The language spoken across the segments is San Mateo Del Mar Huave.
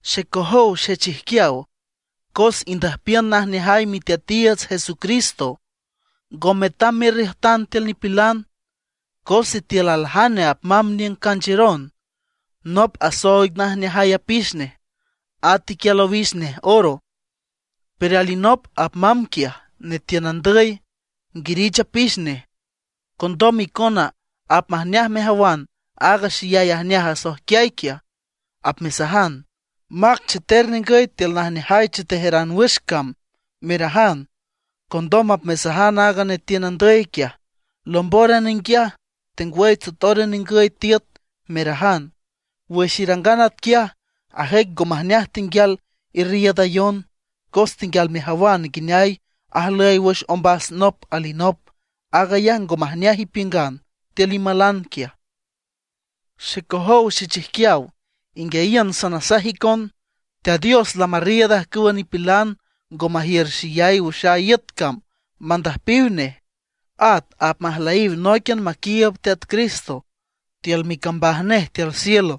Xecojow xechijquiaw, cos indüjpiün najneajay Miteatiiüts Jesucristo, ngo metam merriüjtan tiül nipilan. Cos sitiül aljane apmamb niüng canchiüron, nop asooig najneajay apix nej, at iquial owix nej oro; pero alinop apmamb quiaj netiün andüy, nguirich apix nej; condom icona apmajneaj mejawan aaga xeyay ajneaj asoijquiay quiaj, apmesajan: “Mac cheter ningüy tiül najneajay chetejaran wüx cam”, merajan. Condom apmesajan aaga netiün andüy quiaj: “Lombóran ninguiaj, tengwüy tsotóran ningüy tiüt”, merajan. Wüx irangan atquiaj, ajüic ngo majneaj tenguial irriiüdayon, cos tenguial mejawan nguineay ajlüy wüx ombas nop alinop; aag ayaj ngo majneaj ipiüngan tiül imalan quiaj. Xecojow xechijquiaw, inguiayiün sanasaj icon: Teat Dios lamarriiüd ajcüwa nipilan ngo majiür xeyay wüx aaga iüt cam mandüjpiw nej; at apmajlüyiw nóiquian maquiiüb Teat Cristo tiül micambaj nej tiül cielo.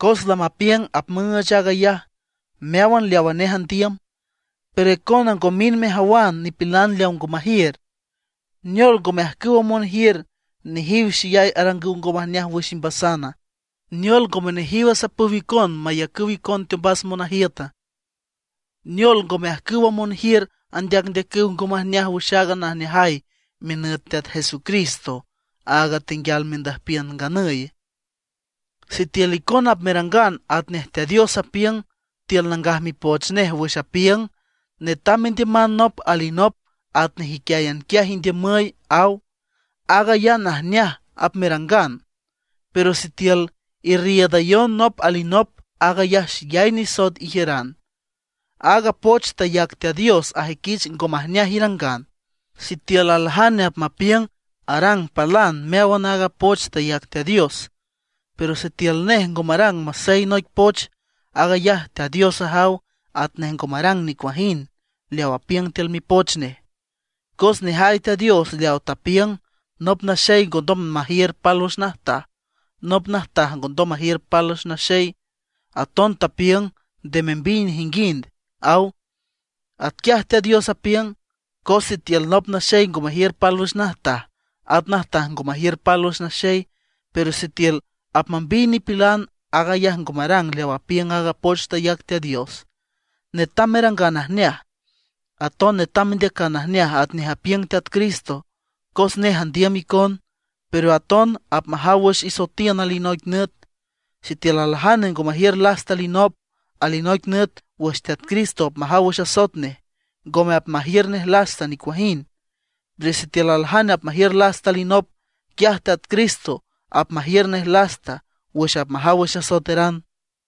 Cos lamapiüng apmüüch aag ayaj meáwan leawa nej andiüm. Pero icona ngo mind mejawan nipilan leaw ngo majiür, ¿neol, ngome ajcüwa monjiür, nejiw xeyay arangüw ngo majneaj wüx imbasana? ¿Neol, ngome nejiw asapüw icon mayacüw icon teombas monajiüta? ¿Neol, ngome ajcüwa monjiür andeacndeacüw ngo majneaj wüx aaga najneajay minüt Teat Jesucristo, áag tenguial mendüjpiün nganüye? Sitiül icona apmerangan atnej Teat Dios apiüng tiül Nangaj Mipoch Nej wüx apiüng: “Netam mendiüman nop alinop atnej iquiáyan quiaj indiümüy”, aw. Aag ayaj najneaj apmerangan. Pero sitiül irriiüdayon nop alinop, aag ayaj xeyay nisoet ijiüran; aaga poch tayac Teat Dios ajüiquich ngo majneaj irangan. Sitiül aljane apmapiüng arang palan meáwan aaga poch tayac Teat Dios; pero sitiül nej ngo marang masey noic poch, aag ayaj Teat Dios ajaw atnej ngo marang nicuajind leaw apiüng tiül Mipoch Nej. Cos nejay Teat Dios leaw tapiüng: “Nop naxey ngondom majiür pálwüx najtaj, nop najtaj ngondom majiür pálwüx naxey”, aton tapiüng: “Nde membiy nejinguind”, aw. Atquiaj Teat Dios apiüng, cos sitiül nop naxey ngo majiür pálwüx najtaj, at najtaj ngo majiür pálwüx naxey, pero sitiül apmambiy nipilan, aag ayaj ngo marang leaw apiüng aaga poch tayac Teat Dios. Netam merangan najneaj, aton netam mendeacan najneaj atnej apiüng Teat Cristo, cos nej andiüm icon, pero aton apmajaw wüx isoetiün alinoic nüt. Sitiül aljane ngo majiür lasta alinop, alinoic nüt wüx Teat Cristo apmajaw wüx asoet nej, ngome apmajiür nej lasta nicuajind. Pero sitiül aljane apmajiür lasta alinop, quiaj Teat Cristo apmajiür nej lasta wüx apmajaw wüx asoeteran.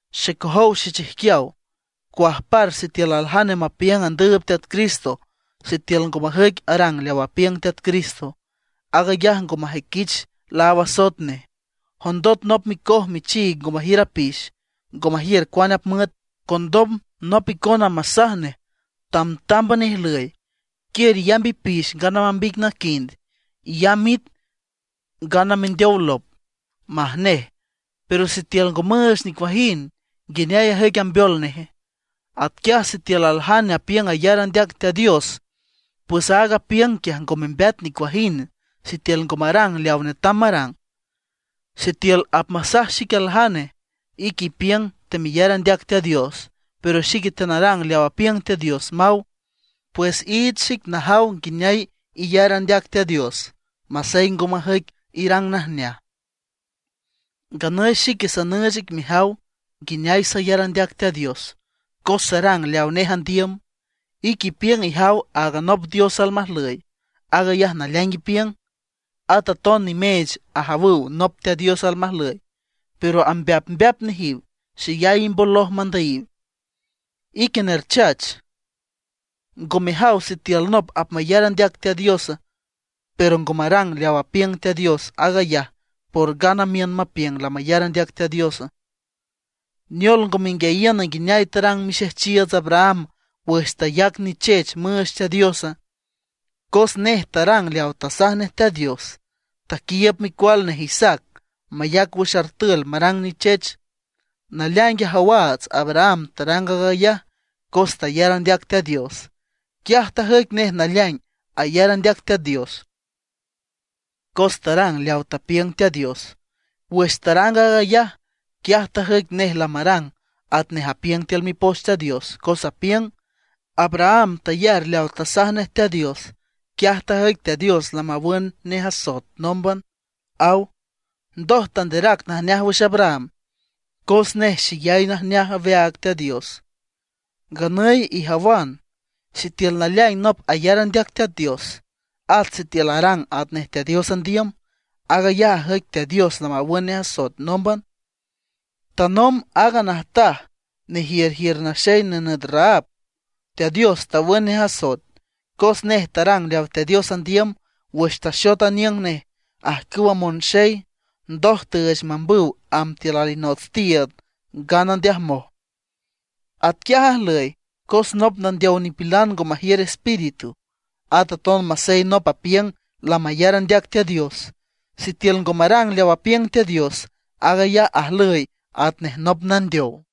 Xecojow xechijquiaw, ¿cuajpar sitiül aljane mapiüng andüüb Teat Cristo sitiül ngo majüic arang leaw apiüng Teat Cristo? Aag ayaj ngo majüiquich laáw asoet nej. Jondot nop micoj michiig ngo majiür apix, ngo majiür cuane apmüet, condom nop icona masaj nej: “Tamtámban ijlüy, quiür iyamb ipix ngana mambiy ic naquind, iyamb it ngana mendeow lop”, maj nej. Pero sitiül ngo müüch nicuajind, ¿nguineay ajüic ambeol neje? Atquiaj sitiül aljane apiüng ayar andeac Teat Dios; pues aaga apiüng quiaj ngo membeat nicuajind sitiül ngo marang leawa netam marang. Sitiül apmasaj xic aljane: “Ique ipiüng temeyar andeac Teat Dios, pero xique teanarang leaw apiüng Teat Dios”, maw. Pues iich xic najaw nguineay iyar andeac Teat Dios masey ngo majüic irang najneaj, nganüy xique sanüüch ic mejaw nguineay sayar andeac Teat Dios cos sarang leawa nej andiüm. Ique ipiüng ijaw áagan nop Dios almajlüy, aag ayaj naleaing ipiüng. At aton nimeech ajawüw nop Teat Dios almajlüy, pero ambeapmbeap nejiw, xeyay imboloj mandüyiw. ¡Ique nerchach! ¿Ngo mejaw sitiül nop apmayar andeac Teat Dios, pero ngo marang leaw apiüng Teat Dios, aag ayaj por ngana miün mapiüng lamayar andeac Teat Dios? ¿Neol ngo menguiayiüna nguineay tarang mixejchiiüts Abraham wüx tayac nichech müüch Teat Diosa? Cos nej tarang leaw tasaj nej Teat Dios, taquiiüb micual nej Isaac mayac wüx artül marang nichech. Naleaing ajawaats Abraham tarang aag ayaj cos tayar andeac Teat Dios. Quiaj tajüic nej naleaing ayar andeac Teat Dios, cos tarang leaw tapiüng Teat Dios. Wüx tarang aag ayaj, quiaj tajüic nej lamarang atnej apiüng tiül Mipoch Teat Dios, cos apiüng: “Abraham tayar leaw tasaj nej Teat Dios, quiaj tajüic Teat Dios lamawün nej asoet nómban”, aw. Ndoj tanderac najneaj wüx Abraham cos nej xeyay ajneaj aweaag Teat Dios. Nganüy ijawan sitiül naleaing nop ayar andeac Teat Dios, at sitiül arang atnej Teat Dios andiüm, aag ayaj ajüic Teat Dios lamawün nej asoet nómban. Tanomb aaga najtaj nejiürjiür naxey nenüt Rahab, Teat Dios tawün nej asoet, cos nej tarang leaw Teat Dios andiüm wüx taxot aniüng nej ajcüwa monxey, ndoj tüüch mambüw amb tiül alinots tiiüd, ngana ndeajmoj. Atquiaj ajlüy, cos nop nandeow nipilan ngo majiür espíritu; at aton masey nop apiüng lamayar andeac Teat Dios, sitiül ngo marang leaw apiüng Teat Dios, aag ayaj ajlüy atnej nop nandeow.